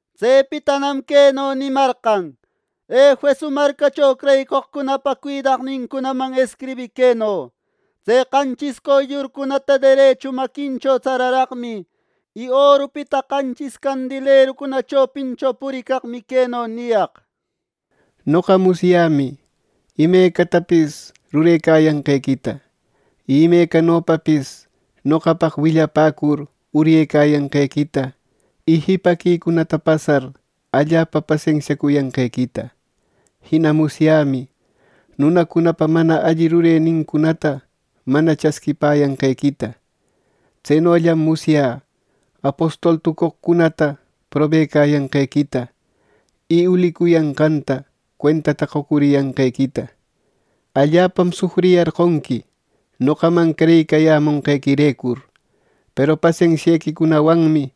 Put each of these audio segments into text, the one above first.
Tsepitanam queno nimarqan: “Efeso marcacho creyicoqcunapa cuidaqnincunaman escribï queno: ‘Tse qanchis qoyllurcunata derechu maquincho tsararaqmi, y orupita qanchis candelerucuna chopincho puricaqmi queno niyaq: Noqa musyämi imecatapis rurecayanqequita, y imecanopapis noqapaq willapäcur uryecayanqequita y jipaquicunata pasar allapa pasensiacuyanqequita. Jina musyämi nunacunapa mana alli rurenincunata mana chasquipäyanqequita. Tsenollam musyä apostol tucoqcunata probecayanqequita, y ulicuyanqanta cuentata qocuriyanqequita. Allapam sufriyarqonqui noqaman creyicayamonqequirecur; peru pasensiequicunawanmi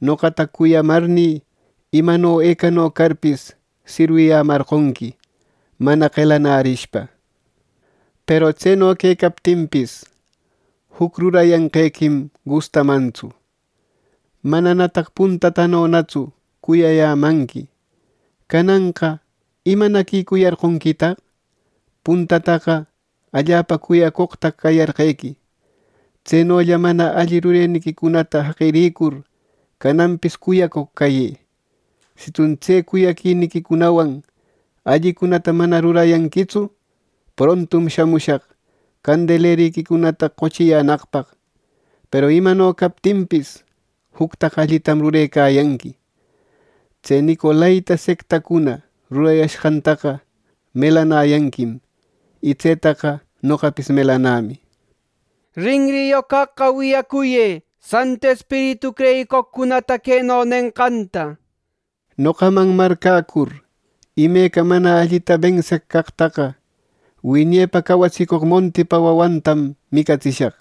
noqata cuyamarnï, imano ecano carpis sirwiyämarqonqui mana qelanärishpa. Peru tseno quecaptinpis, juc rurayanqequim gustamantsu: Mananataq puntatanonatsu cuyayämanqui. Cananqa ¿imanaquicuyarqonquitaq! Puntataqa allapa cuyacoqtaq cayarqequi. Tsenolla mana alli rureniquicunata jaqiricur cananpis cuyacoq cayë. Sitsun tse cuyaquiniquicunawan allicunata mana rurayanquitsu, prontum shamushaq candeleriquicunata qochiyänaqpaq. Peru imano captinpis, juctaqa allitam rurecayanqui: Tse nicolaita sectacuna rurayashqantaqa melanayanquim, y tsetaqa noqapis melanämi. Rinriyoq caqqa wiyacuyë, Santu Espiritu creyicoqcunata queno nenqanta: Noqaman marcäcur imeca mana allita benseq caqtaqa, wiñepa cawatsicoq montipa wawantam micatsishaq.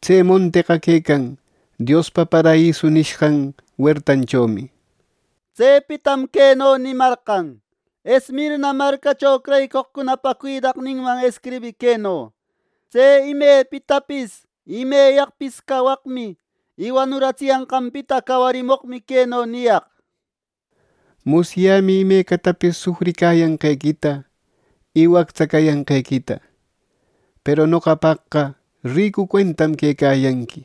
Tse monteqa quecan Diospa “paraiso” nishqan huertanchomi.’” Tsepitam queno nimarqan: “Esmirna marcacho creyicoqcunapa cuidaqninman escribï queno: ‘Tse imepitapis y imeyaqpis cawaqmi y wanuratsiyanqanpita cawarimoqmi queno niyaq: Musyämi imecatapis sufriyanqequita y wactsa cayanqequita. ¡Peru noqapaqqa ricu cuentam quecayanqui!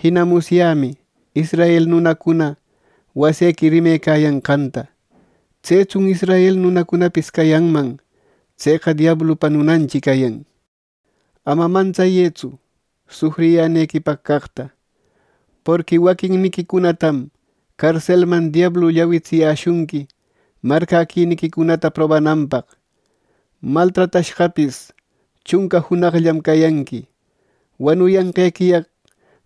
Jina musyämi israel nunacuna wasequi rimecayanqanta. Tsetsun israel nunacunapis cayanman. Tseqa diablupa nunanchi cayan. Ama mantsayëtsu sufriyänequipaq caqta, porqui waquinniquicunatam carselman diablu llawitsiyäshunqui marcäquiniquicunata probananpaq. Maltratashqapis chunca junaqllam cayanqui. Wanuyanqequiyaq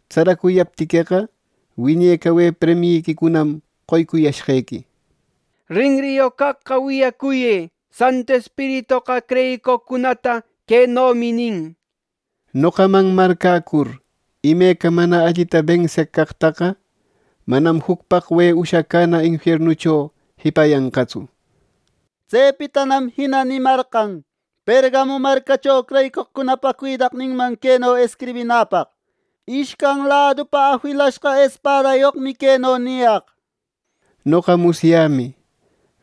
tsaracuyaptiqueqa, wiñe cawe premiyiquicunam qoycuyashqequi. Rinriyoq caqqa wiyacuyë, Santu Espiritoqa creyicoqcunata quenomi nin: Noqaman marcäcur imeca mana allita benseq caqtaqa, manam juc paqwe ushacäna infiernucho jipayanqatsu.’” Tsepitanam jina nimarqan Pergamo marcacho creyicoqcunapa cuidaqninman queno escribinäpaq: “Ishcan ladupa afilashqa espadayoqmi queno niyaq: Noqa musyämi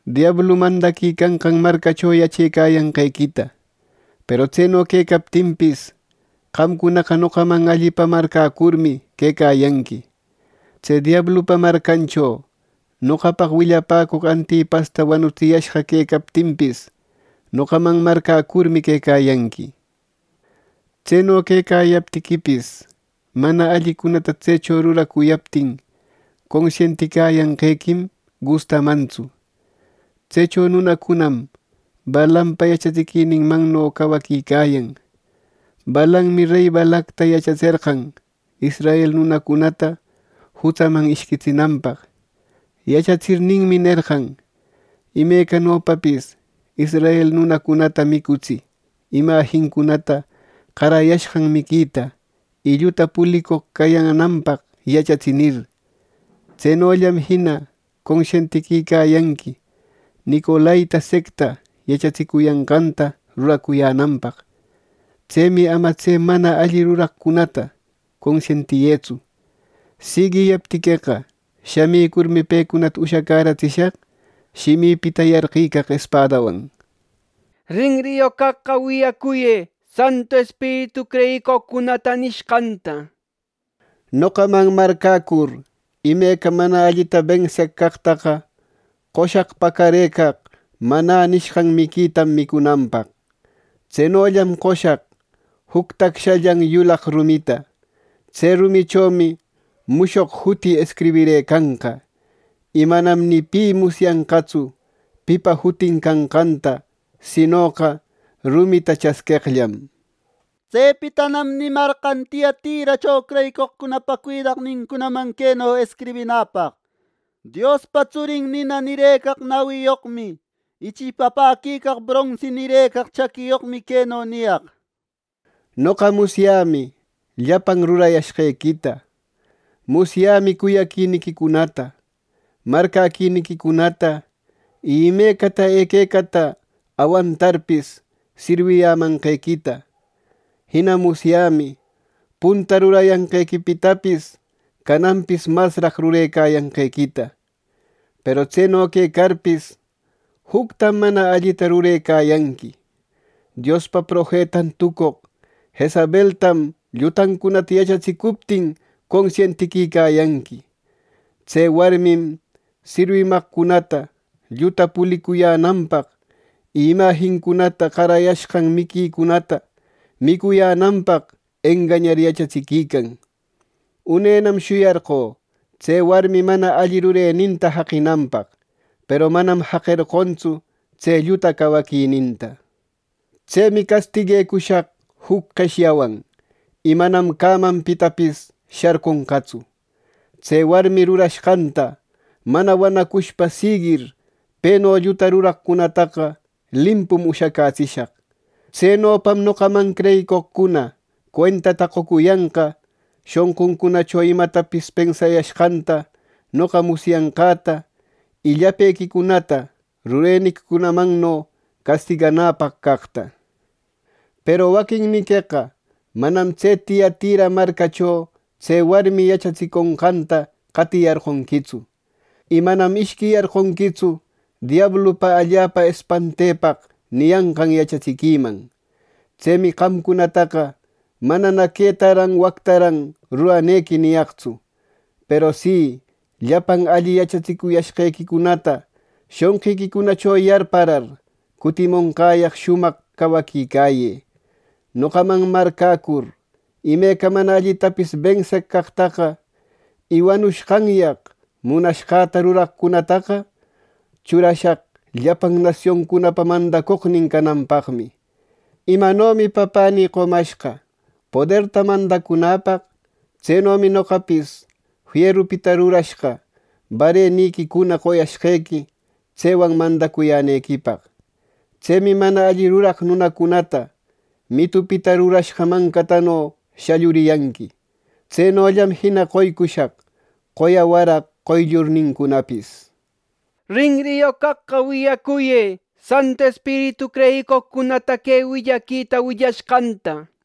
diablu mandaquicanqan marcacho yachecayanqequita. Peru tseno quecaptinpis, qamcunaqa noqaman allipa marcäcurmi quecayanqui. Tse diablupa marcancho noqapaq willapäcoq Antipasta wanutsiyashqa quecaptinpis noqaman marcäcurmi quecayanqui. Tseno quecayaptiquipis, mana allicunata tsecho ruracuyaptin consientiyanqequim gustamantsu. Tsecho nunacunam Balaampa yachatsiquininmanno cawaquicayan. Balaammi rey Balacta yachatserqan, israel nunacunata jutsaman ishquitsinanpaq. Yachatsirninmi nerqan: Imecanopapis israel nunacunata micutsï imajincunata qarayashqan miquita, y lluta pulicoq cayänanpaq yachatsï, nir. Tsenollam jina consientiquicayanqui nicolaita secta yachatsicuyanqanta ruracuyänanpaq. Tsemi ama tse mana alli ruraqcunata consientiyëtsu. Siguiyaptiqueqa, shamicurmi pecunata ushacäratsishaq shimïpita yarqicaq espadawan. “Rinriyoq caqqa wiyacuyë Santu Espiritu creyicoqcunata nishqanta. Noqaman marcäcur imeca mana allita benseq caqtaqa qoshaq pacarëcaq ‘Manä’ nishqan miquitam micunanpaq. Tsenollam qoshaq juc tacshallan yulaq rumita. Tse rumichomi mushoq juti escribirëcanqa. Y manam ni pi musyanqatsu pipa jutin canqanta, sinoqa rumita chasqueqllam.” Tsepitanam nimarqan Tiatiracho creyicoqcunapa cuidaqnincunaman queno escribinäpaq: “Diospa Tsurin nina nirëcaq nawiyoqmi, y chipapäquicaq bronsi nirëcaq chaquiyoqmi queno niyaq: Noqa musyämi llapan rurayashqequita. Musyämi cuyaquiniquicunata, marcäquiniquicunata y imecata equecata awantarpis sirwiyämanqequita. Jina musyämi punta rurayanqequipitapis cananpis masraq rurecayanqequita. Peru tseno quecarpis, juctam mana allita rurecayanqui: Diospa profetan tucoq Jezabeltam llutancunata yachatsicuptin consientiquicayanqui. Tse warmim sirwimaqcunata lluta pulicuyänanpaq, y imajincunata qarayashqan miquicunata micuyänanpaq engañar yachatsiquican. Unenam shuyarqö tse warmi mana alli rureninta jaqinanpaq; peru manam jaqerqontsu tse lluta cawaquininta. Tsemi castiguecushaq juc qeshyawan, y manam cämapitapis sharconqatsu. Tse warmi rurashqanta mana wanacushpa siguir peno lluta ruraqcunataqa limpum ushacätsishaq. Tsenopam noqaman creyicoqcuna cuentata qocuyanqa shonquncunacho imatapis pensayashqanta noqa musyanqäta, y llapequicunata rureniquicunamanno castiganäpaq caqta. Peru waquinniqueqa manam tse Tiatira marcacho tse warmi yachatsiconqanta qatiyarqonquitsu. Y manam ishquiyarqonquitsu ‘¡Diablupa allapa espantepaq!’ niyanqan yachatsiquiman. Tsemi qamcunataqa manana ‘Quetaran wactaran ruranequi’ niyaqtsu. Peru si llapan alli yachacuyashqequicunata shonqiquicunacho yarparar, cutimonqäyaq shumaq cawaquicayë. Noqaman marcäcur imeca mana allitapis benseq caqtaqa, y wanushqanyaq munashqäta ruraqcunataqa, churashaq llapan nasioncunapa mandacoqnin cananpaqmi. Imanomi Papänï qomashqa poderta mandacunäpaq, tsenomi noqapis fierupita rurashqa barrequicuna qoyashqequi, tsewan mandacuyänequipaq. Tsemi mana alli ruraq nunacunata mitupita rurashqa mancatano shalluriyanqui. Tsenollam jina qoycushaq qoya waraq qoyllurnincunapis. Rinriyoq caqqa wiyacuyë Santu Espiritu creyicoqcunata que willaquita willashqanta.”